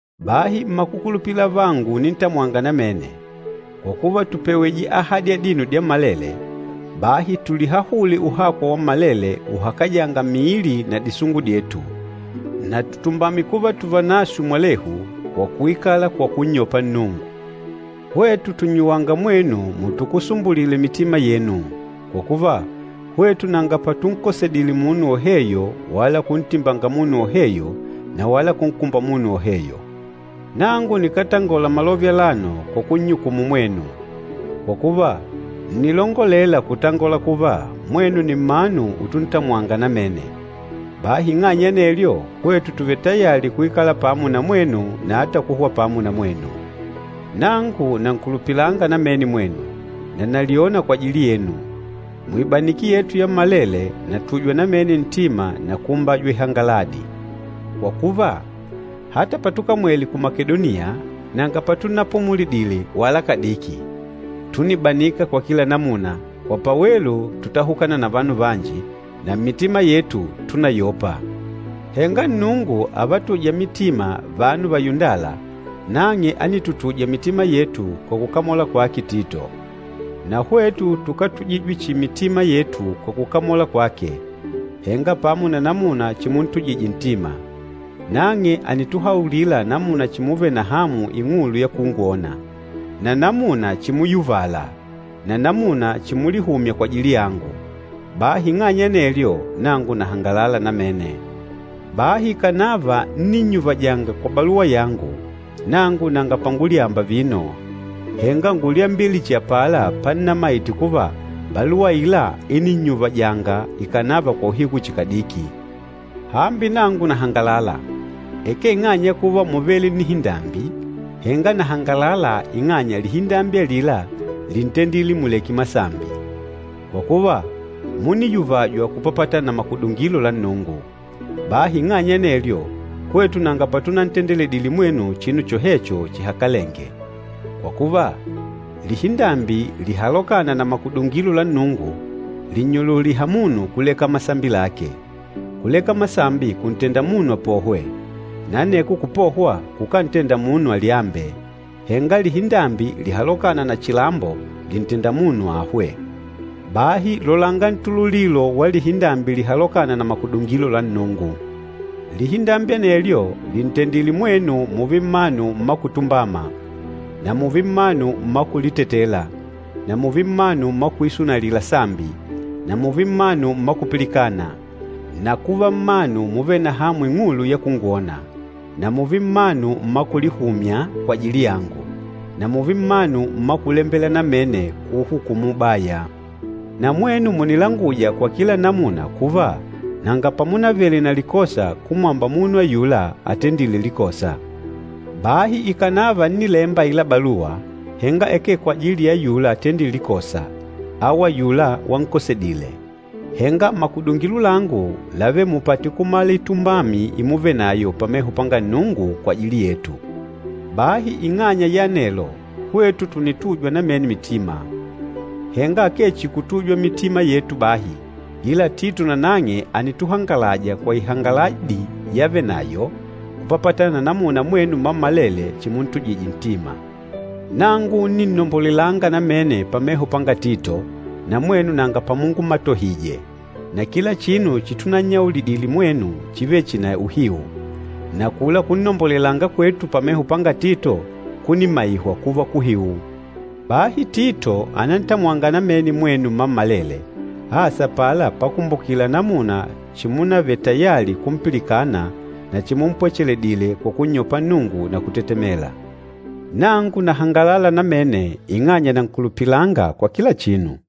Bahi mmakukulupila avangu unintamwanga namene, kwa kuva tùpewije ahadi adino dyammalele, bahi tulihahule uhakwa wammalele uhakajânga miili na disungu dyetu, na tutumbame kuva tuvanaswe mwalehu kwa kuikala kwa kunnyopa Nnungu. Hwetu tùnnyuwanga mwenu mutukusumbulile mitima yenu! Kwa kuva, hwetu nanga patunkosedile munu woheyo wala kuntimbanga munu woheyo na wala kunkumba munu woheyo. Nangu nikátangola malove alano kwa kunnyukumu mwenu. Kwa kuva, ǹnilongolela kutangola kuva, mwenu nni mmanu utuntamwanga namene. Bahi ing'anya ya anelyo, hwetu tùvele tayali kuikala pamo na mwenu na ata kuhwa pamo na mwenu. Nangu nankulupilanga namene mwenu, na nalyona kwajili yenu. Muibaniki yetu yammalele, natujwa namene ntima na kuumbajwa ihangaladi. Kwa kuva, ata patukamwele ku Makedoniya nanga patunapumulidile wala kadiki. Túnibanika kwa kila namuna, kwa pawelu tútahukana na vanu vanji, na mmitima yetu, túnayopa. Henga Nnungu, avatûja mitima vanu vayundâla, nang'e ánitutuja mitima yetu kwa kukamola kwake Tito. Na hwetu tukátujijwe chihi mitima yetu kwa kukamola kwake, henga pamo na namuna chimuntujije ntima. Nang'e ànituhaulila namuna chimuvele na hamu ing'ulu ya kungwona, na namuna chimuyuvala, na namuna chimulihumya kwajili yangu. Bahi ing'anya ya anelyo, nangu nahangalala namene. Bahi ikànava ńninnyuvajanga kwa baluwa yangu, nangu nanga pangulyamba vino. Henga ngúlyambile chihi apala pannamaite kuva baluwa aila íninnyuvajanga ikànava kwa uhiku chihi kadiki. Hambi nangu nahangalala, akee ing'anya ya kuva múvele nnihindambi, henga nahangalala ing'anya lihindambi alila líntendile muleke masambi. Kwa kuva, múniyuvajwa kupapatana na makudungilo la Nnungu. Bahi ing'anya ya anelyo, hwetu nanga patunantendeledile mwenu chinu chohecho chihakalenge. Kwa kuva, lihindambi lihalokâna na makudungilo la Nnungu lìnnyululiha munu kuleka masambi lake. Kuleka masambi kuntenda munu apohwe, na aneko kupohwa kukántenda munu alyambe. Henga lihindambi lihalokâna na chilambo lìntenda munu ahwe. Bahi lolanga ntululilo wa lihindambi lihalokâna na makudungilo la Nnungu! Lihindambi anelyo lìntendile mwenu mùùve mmanu mma kutumbama, na mùùve mmanu mma kulitetela na mùùve mmanu mma kuisunalila sambi na mùùve mmanu mma kupilikana, na kuva mmanu muvêle na hamu ing'ulu ya kungwona, na mùùve mmanu mma kulihumya kwajili yangu, na mùùve mmanu mma kulembela namene kuuhukumu ubaya. Na mwenu mùnilanguja kwa kila namuna kuva nanga pamunavele na likosa kumwamba munu ayula atendîle likosa. Bahi ikànava ńnilemba aila baluwa, henga akee kwajili ya ayula atendîle likosa au ayula wankosedile. Henga makudungilo langu lávele mupate kumala itumbami imuvenayo pameho panga Nnungu kwajili yetu. Bahi ing'anya ya anelo, hwetu tùnitujwa namene mitima. Henga akee chihi kutujwa mitima yetu bahi, ila Tito nanang'e ànituhangalaja kwa ihangaladi yavenayo kupapatana na namuna mwenu mmammalele chimuntujije ntima. Nangu ńninnombolelanga namene pameho panga Tito, na mwenu nanga pamungumatohije. Na kila chinu chitunannyaulidile mwenu chívele chihi cha uhiu, na akula kunnombolelanga kwetu pameho panga Tito kùnimaihwa kuva kuhiu. Bahi Tito ànantamwanga namene mwenu mmammalele, asa apala pakumbukila namuna chimunavele tayali kumpilikana na chimumpwechedile kwa kunnyopa Nnungu na kutetemela. Nangu nahangalala namene ing'anya nankulupilanga kwa kila chinu.